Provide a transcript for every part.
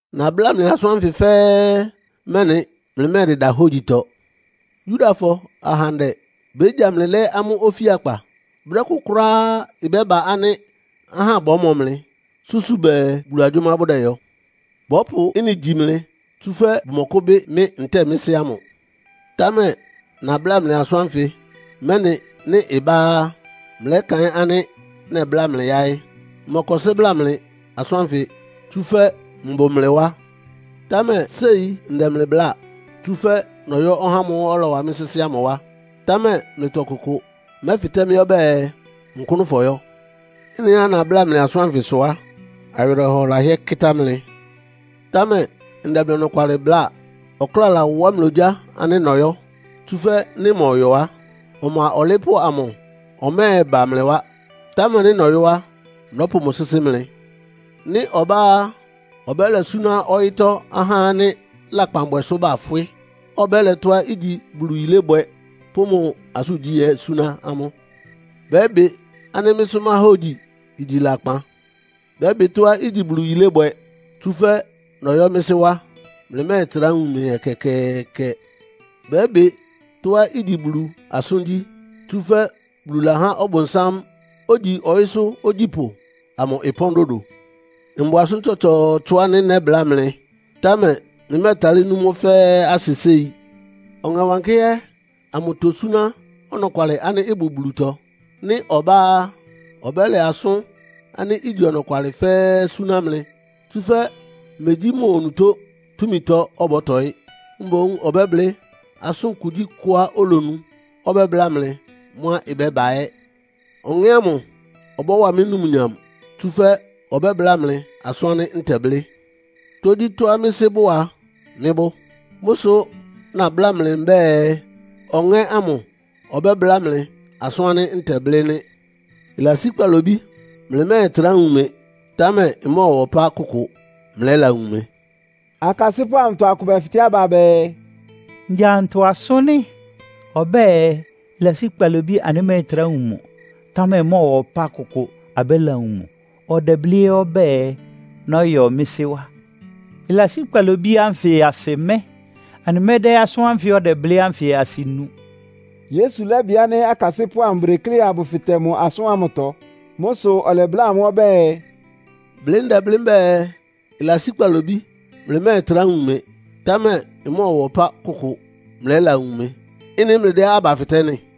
“Nabláa mlɩ asʋ́n anfɩ fɛ́ɛ́, mɛ́nɩ mlɩmɛ́ɛdɩda hógyitɔ. Yudafɔ ahandɛ bégya mlɩ lɛ́ amʋ́ ofíakpa. Brɛ́ kʋ kʋ́ráá ɩbɛ́ba ánɩ́ ahá bɔ́mɔ mlɩ, súsu bɛɛ Bulu agyʋ́má bʋdɛyɔ. Bɔ́pʋ ɩ́nɩ gyi mlɩ, tsúfɛ́ bʋmɔkʋ́bɩ́ mɩ́ ntɛ́ɛ mɩ́ Sɩ́ ámʋ. Támɛ nabláa mlɩ asʋ́n ánfɩ, mɛ́nɩ nɩ́ ɩbá á, mlɛ́kaɩ́n ánɩ́ nɛbláa mlɩ yáɩ́. “Mmɔkɔsɩ́ bláa mlɩ asʋ́n ánfɩ, tsúfɛ́ mbʋ mlɩ wá. Támɛ séi ndɛ mlɩ bláa, tsúfɛ́ nɔyɔ́ ɔhá ámʋ́ʋ́ ɔlɔwa mɩ́ sɩ́sɩ́ ámʋ wá. Támɛ mlɩtɔ ɔkʋkʋ mɛ́fɩtɛ́ mɩ́ ɔbɛ́ɛ, ‘Nkʋ́nʋ́ fɔyɔ́.’ Ɩ́nɩá nabláa mlɩ asʋ́n ánfɩ sʋ á, awɩrɛhɔ lahɩ́ɛ́ kɩ́tá mlɩ. Támɛ ndɛ mlɩ ɔnɔkwalɩ bláa. Ɔkláa lawá mlɩ ogyá ánɩ́ nɔyɔ́. Tsúfɛ́ nɩ́ mmɔyɔ á, Ɔma Ɔlɩɩ́pʋ́ amʋ ɔmɛ́ɛba mlɩ wá. Támɛ nɩ́ nɔyɔ́ á, nɔ́pʋ mʋ sɩ́sɩ́ mlɩ. Nɩ́ ɔbá á, ɔbɛ́lɛ súná ɔyɩ́tɔ́ ahá ánɩ́ lakpanbwɛ sʋ bafwɩ́, ɔbɛ́lɛ tɔ́á igyi Bulu yilébwɛ pʋ́ mʋ asʋ́ngyí ɛ́ súná amʋ́. Bɛ́bɩ ánɩ́ mɩ́sʋ́ máhógyi igyi lakpan. Bɛ́bɩ tɔ́á igyi Bulu yilébwɛ, tsúfɛ́ nɔyɔ́ mɩ́ Sɩ́ wá, mlɩmɛ́ɛtrá wun mɩ ɛkɛkɛɛkɛ. Bɛ́bɩ tɔ́á igyi Bulu asʋ́ngyí, tsúfɛ́ Bulu lahá ɔbʋnsám, ogyi ɔyɩ́sʋ́ ogyípʋ́ amʋ ɩpɔ́n dodo. “Mbʋ asʋ́n tsɔtsɔɔtsɔ ánɩ́ nɛ́bláa mlɩ, támɛ mlɩmɛ́ɛtalɩ́ nú mʋ́ fɛ́ɛ́ asɩ séi. Ɔŋɛ Wankɩ́hɛ́ amʋ tósúná ɔnɔkwalɩ ánɩ́ ɩbʋ Bulutɔ. Nɩ́ ɔbá á, ɔbɛ́lɛ asʋ́n ánɩ́ igyi ɔnɔkwalɩ fɛ́ɛ́ súná mlɩ. Tsúfɛ́ megyí mʋ onutó túmitɔ ɔbɔ́tɔɩ́, mboún ɔbɛ́blɩ́ asʋ́n kugyíkʋá olonu. Ɔbɛ́bláa mlɩ mʋ́á ɩbɛ́ba ɛ́. Ɔŋɛ́ ámʋ ɔbɔ́wa mɩ́ numnyam, tsúfɛ́ ɔbɛ́bláa mlɩ asʋ́n ánɩ́ ntɛblɩ́. Tógyítɔ́á mɩ́ Sɩ́ bʋ́ʋ a, mɩ́ bʋ́. Mʋ́ sʋ nabláa mlɩ mbɛ́ɛ, Ɔŋɛ́ ámʋ ɔbɛ́bláa mlɩ asʋ́n ánɩ́ ntɛblɩ́ nɩ́. “Ɩlasí kpalobí mlɩmɛ́ɛtrá wun mɩ, támɛ ɩmɔ́ɔwa ɔpá kʋkʋ mlɛ́lawun mɩ.” Akasɩ́pʋ́ amʋtɔ akʋ bɛfɩtɛ́ aba bɛɛ, “Ngya ntɔ asʋ́n nɩ́? Ɔbɛ́ɛ, Ɩlasí kpalobí, anɩmɛ́ɛtrá wun mʋ, támɛ ɩmɔ́ɔwa ɔpá kʋkʋ, abɛ́lawun mʋ. Ɔdɛblɩ́ ɛ́ ɔbɛ́ɛ, ‘Nɔyɔ́ mɩ́ Sɩ́ wá?’ ‘Ɩlasí kpalobí’ ánfɩ asɩ mɛ́? Anɩmɛ́dɛ́ asʋ́n ánfɩ ɔdɛblɩ́ ánfɩ asɩ nu.” Yesu lɛ́bɩ ánɩ́ akasɩ́pʋ́ amʋ bʋdeklé abʋfɩtɛ mʋ asʋ́n ámʋtɔ. Mʋ́ sʋ ɔlɛbláa amʋ́ ɔbɛ́ɛ, “Blɩ́ ndɛblɩ́ mbɛ́ɛ, ɩlasí kpalobí mlɩmɛ́ɛtrá wun mɩ. Támɛ ɩmɔ́ɔwa ɔpa kʋkʋ mlɛ́lawun mɩ. Ɩ́nɩ mlɩdɛ́ aba fɩtɛ́ nɩ́?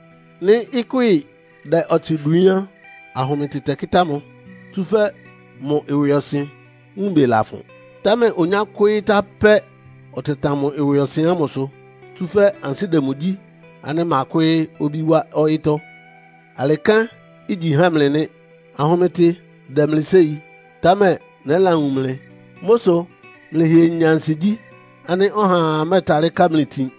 Nɩ́ ɩkwɩ́ɩ dɛ ɔtsɩ dwiín á, ahʋmɩtɩ tɛkɩ́tá mʋ, tsúfɛ́ mʋ ɩwɩɔsɩn wúunbɩ lafʋn. Támɛ onyákwɩ́ɩ́ tá pɛ́ ɔtɛtan mʋ ɩwɩɔsɩn ámʋsʋ, tsúfɛ́ ansɩ́ dɛ mʋ gyí ánɩ́ makwɩ́ɩ́ obí wá ɔyɩ́tɔ́. Alɩ kɛ́n igyi há mlɩ nɩ́. Ahʋmɩtɩ dɛ mlɩ séi, támɛ nɛ́lawun mlɩ. Mʋ́ sʋ mlɛ́hɩɛ nyá ansigyí ánɩ́ ɔhaa mɛ́ɛtalɩ́ ká mlɩ itin.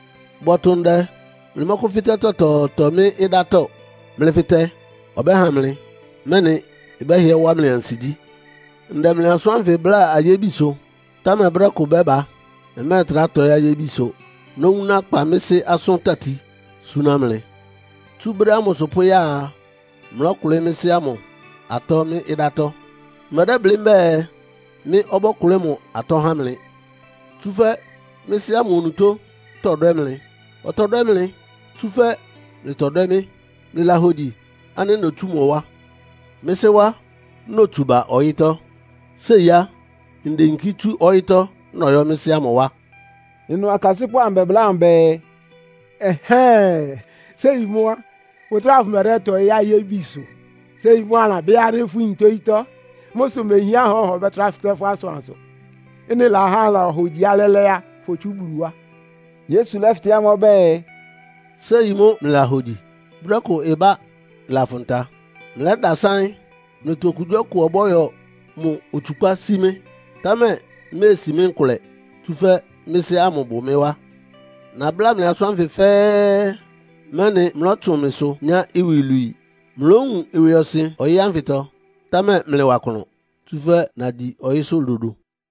Bɔtʋ ndɛ mlɩmɔ́kʋ́fɩ́tɛ́ tɔtɔɔtɔ mɩ́ ɩdátɔ́. Mlɩfɩtɛ, ɔbɛ́ha mlɩ, mɛ́nɩ ɩbɛ́hɩɛ wá mlɩ ansigyí. “Ndɛ mlɩ asʋ́n ánfɩ bláa ayébisʋ, támɛ brɛ́ kʋ bɛ́ba, mmɛ́ɛtrá tɔɩ́ ayébisʋ. Nówuná kpa mɩ́ Sɩ́ asʋ́n tati súná mlɩ. Tsú brɛ́ ámʋsʋ pʋ́ya a, mlɔ́kʋlɩ́ mɩ́ Sɩ́ ámʋ atɔ́ mɩ́ ɩdátɔ́. Mmɛdɛ́blɩ́ mbɛ́ɛ, mɩ́ ɔbɔ́kʋlɩ́ mʋ atɔ́ há mlɩ. Tsúfɛ́ mɩ́ Sɩ́ ámʋ onutó tɔdwɛ́ mlɩ. Ɔtɔdwɛ́ mlɩ, tsúfɛ́ mlɩtɔdwɛ́ mɩ́, mlɩlahogyi ánɩ́ notsú mʋ wá. Mɩ́ Sɩ́ wá notsu ba ɔyɩ́tɔ́. Séi á, ndeyinkí tsú ɔyɩ́tɔ́ nɔyɔ́ mɩ́ Sɩ́ ámʋ wá.” Ɩnʋ akasɩ́pʋ́ amʋ bɛbláa mʋ bɛɛ, “Ɛhɛ́ɛn! Séi mʋ́ á, fʋtráa fʋmɛdɛ́tɔɩ́ ayébisʋ. Séi mʋ́ anɩlabɩ́ ánɩ́ fʋyin tógyítɔ́. Mʋ́ sʋ mehián ánɩ́ ɔhaa ɔbɛ́trá fɩtɛ́ fʋ́ asʋansʋ. Ɩ́nɩ lahá anɩlahogyi ánɩ́ lɛ́lɛ́ fotsú Bulu wá.” Yesu lɛ́fɩtɛ́ amʋ́ ɔbɛ́ɛ, “Séi mʋ́ mlɩlahogyi? Brɛ́ kʋ ɩbá. Ɩlafʋn ta, mlɛ́dasáɩ́n. Mlɩtɔ okugyíɔkʋ ɔbɔ́yɔ mʋ otsukpá sí mɩ́. Támɛ iméesi mɩ́ nkʋlɛ, tsúfɛ́ mɩ́ Sɩ́ ámʋ bʋ mɩ́ wá. Nabláa mlɩ asʋ́n ánfɩ fɛ́ɛ́, mɛ́nɩ mlɔ́tsʋn mɩsʋ nyá iwilwii. Mlówun ɩwɩɔsɩn ɔyɩ́ ánfɩtɔ, támɛ mlɩwa klʋn, tsúfɛ́ nagyi ɔyɩ́sʋ́ dodo!”